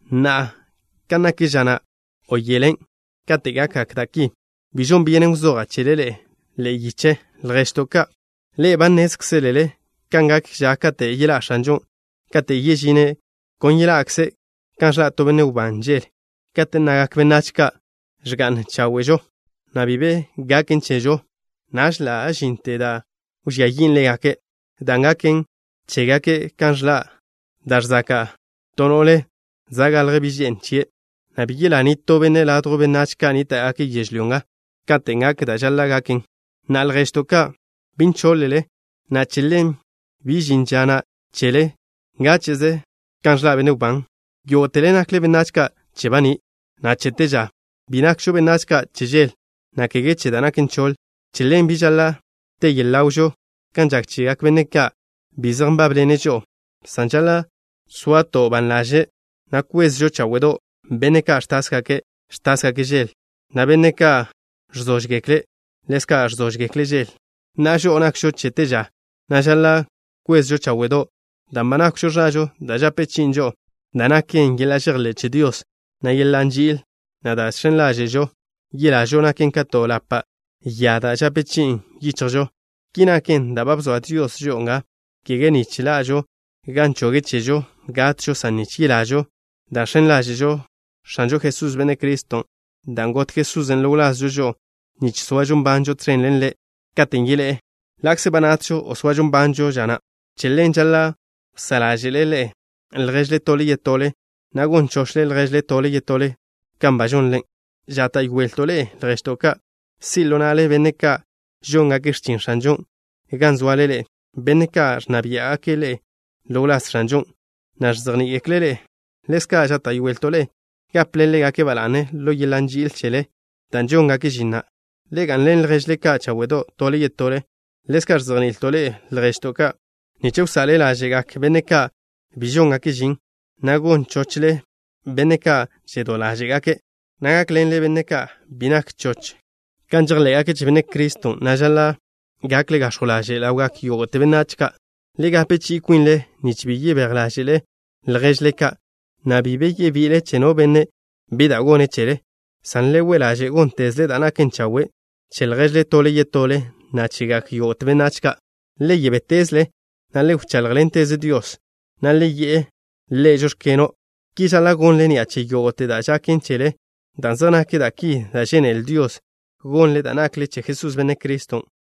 Na'a, kan nak ža na' o yelen' katen' gakgak da' ki, bi žon byenen wzoja' chele ḻe'e ḻe'e yiche, lježto' ka'. Ḻe'e ba nnézkzelele kan gak ža kate' yeḻá' X̱anžon'. Katen' yežine', kon yeḻa'kze' kan ẕḻa' to benne' wbán žel. Kate' nnagak benách ka': “Ẕga'n cháwe'žo, na' bi be gaken chežo” naž ḻa' žinte da' wžía yin' ḻégake', dan' gaken chégake' kan ẕḻa' da' ẕzaka' to no'le za' galj bi' že'n chie', na' bi yelá nitó benne' ladjw benách ka' nníta'gake' yežlyó nga katen' gak dan' žaḻa' gaken. Na'a, lježto' ka', bi nchoḻ-le, na' che ḻen bi žin ža na' chele ngáche'ze kan ẕḻa' benne' wbán. Yógo'tele nakle benách ka' che baní', na' che te ža. Bi nakžo benách ka' che žel, na' kege che da' naken choḻ. Che ḻen, bi žaḻa' te yele ḻawžo kan žak chegak benne' ka' bi zej nbábḻene' žo'o, san žaḻa' soato' ban ḻaže', na' kwezžo cháwe'do'. Benne' ka' ẕtásgake', ẕtásgake' žel, na' benne' ka' ẕzóžgekle', ḻezka' ẕzóžgekle' žel. Na'a, žo'o nakžo che te ža, na' žaḻa' kwezžo cháwe'do', dan' ba nákwžo ẕažo da' žape chi'in žo'o, da' naken yeḻa' žejḻé' che Dios, na' yeḻa' nži'il, na' da' žx̱en ḻáže'žo yelažo naken ka to ḻapa' ya da' žape chi'in yichjžo. Ki naken dan' bzoa Dios žo'o nga, kege nich ḻa'žo gan choge' chežo gatžo, san nich yelažo dan' žx̱en ḻáže'žo X̱anžo Jesús, Benne' Criston', dan' got Jesusen' ḻo wlazžo žo'o nich soažo nbanžo tẕen ḻen Ḻe' katen' yeḻé'e, ḻa'kze ba natžo o soažo nbanžo ža na'. Che ḻen žaḻa' wsá' ḻáže'le lježle tole yetole, na' gon chochle lježle tole yetole kan ba žonle. Žáta'yoelto' ḻe'e, lježto' ka', si' ḻo na'le benne' ka' žóngake' x̱chin X̱anžon' gan zoale ḻe'e, benne' ka' ẕnna biá'gake' ḻe'e ḻo wláz X̱anžon', na' ẕzejní'igekle' ḻe'e. Ḻezka' žáta'yoelto' ḻe'e, gaple ḻégake' ba la'ne ḻo yeḻa' nži'il chele, dan' žóngake' žin na'. Le ga'nḻen lježle ka' cháwe'do' tole yetole. Ḻezka' ẕzejni'ilto' ḻe'e, lježto' ka', nich wsa'le ḻáže'gak benne' ka' bi žóngake' žin, na' gon chochle benne' ka' žedó ḻáže'gake', na' gákḻenle benne' ka' bi nak choch kan žejḻé'gake' che Benne' Criston', na' žaḻa' gakle gax̱jw ḻaže' ḻawgak yógo'te benách ka'. Le gape chi'i kwinle nich bi yebéj ḻáže'le lježle ka', na' bi be yebi'ile che no benne' bi da' gone' cheḻe, san le we' ḻaže' góntezle da' naken chawe' che lježle tole yetole, na' chegak yógo'te benách ka'. Le yebétezle, na' le wcháḻjḻenteze Dios, na' le yi'e Ḻe': “Žóx̱keno'.” Ki žaḻa' gonle ni'a che yógo'te da' žaken chele, dan' zej nak da' ki da' žénele Dios gonle dan' nakle che Jesús, Benne' Criston'.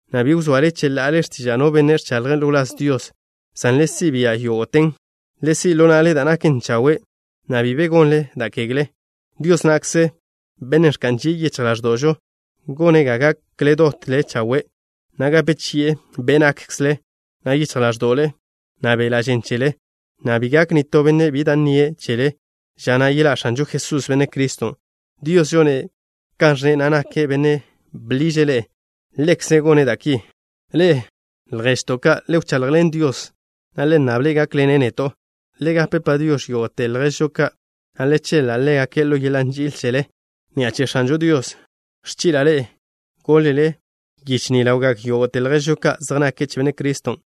na' bi wzoale cheḻa'ale x̱tiža' no benne' ẕchaḻje' ḻo wláz Dios, san le si' bia' yógo'ten. Le si' ḻo na'le da' naken chawe', na' bi be gonle da' kegle. Dios na'kze, Bennen' ẕka'n žie' yichj ḻáẕdo'žo, gone' ga gakle dot chawe', na' gape chi'e be' nákkzele, na' yichj ḻáẕdo'le, na' beḻa' žen chele, na' bi gak nitó benne' bi da' nnie' chele ža na' yeḻá' X̱anžo Jesús, Benne' Criston'. Dios žone' kan ẕnne', na' nake' Bennen' bḻiže' ḻe'e. Ḻekze' gone' da' ki. Ḻe'e, lježto' ka', le wchaḻjḻen Dios, na' le nnable' gákḻene' neto'. Le gape “Padiox̱” yógo'te lježžo ka', na' le cheḻa' ḻégake' ḻo yeḻa' nži'il chele. Ni'a che X̱anžo Dios ẕchi'la' ḻe'e goḻ-le yiche ni ḻawgak yógo'te lježžo ka' zej nake' che Benne' Criston'.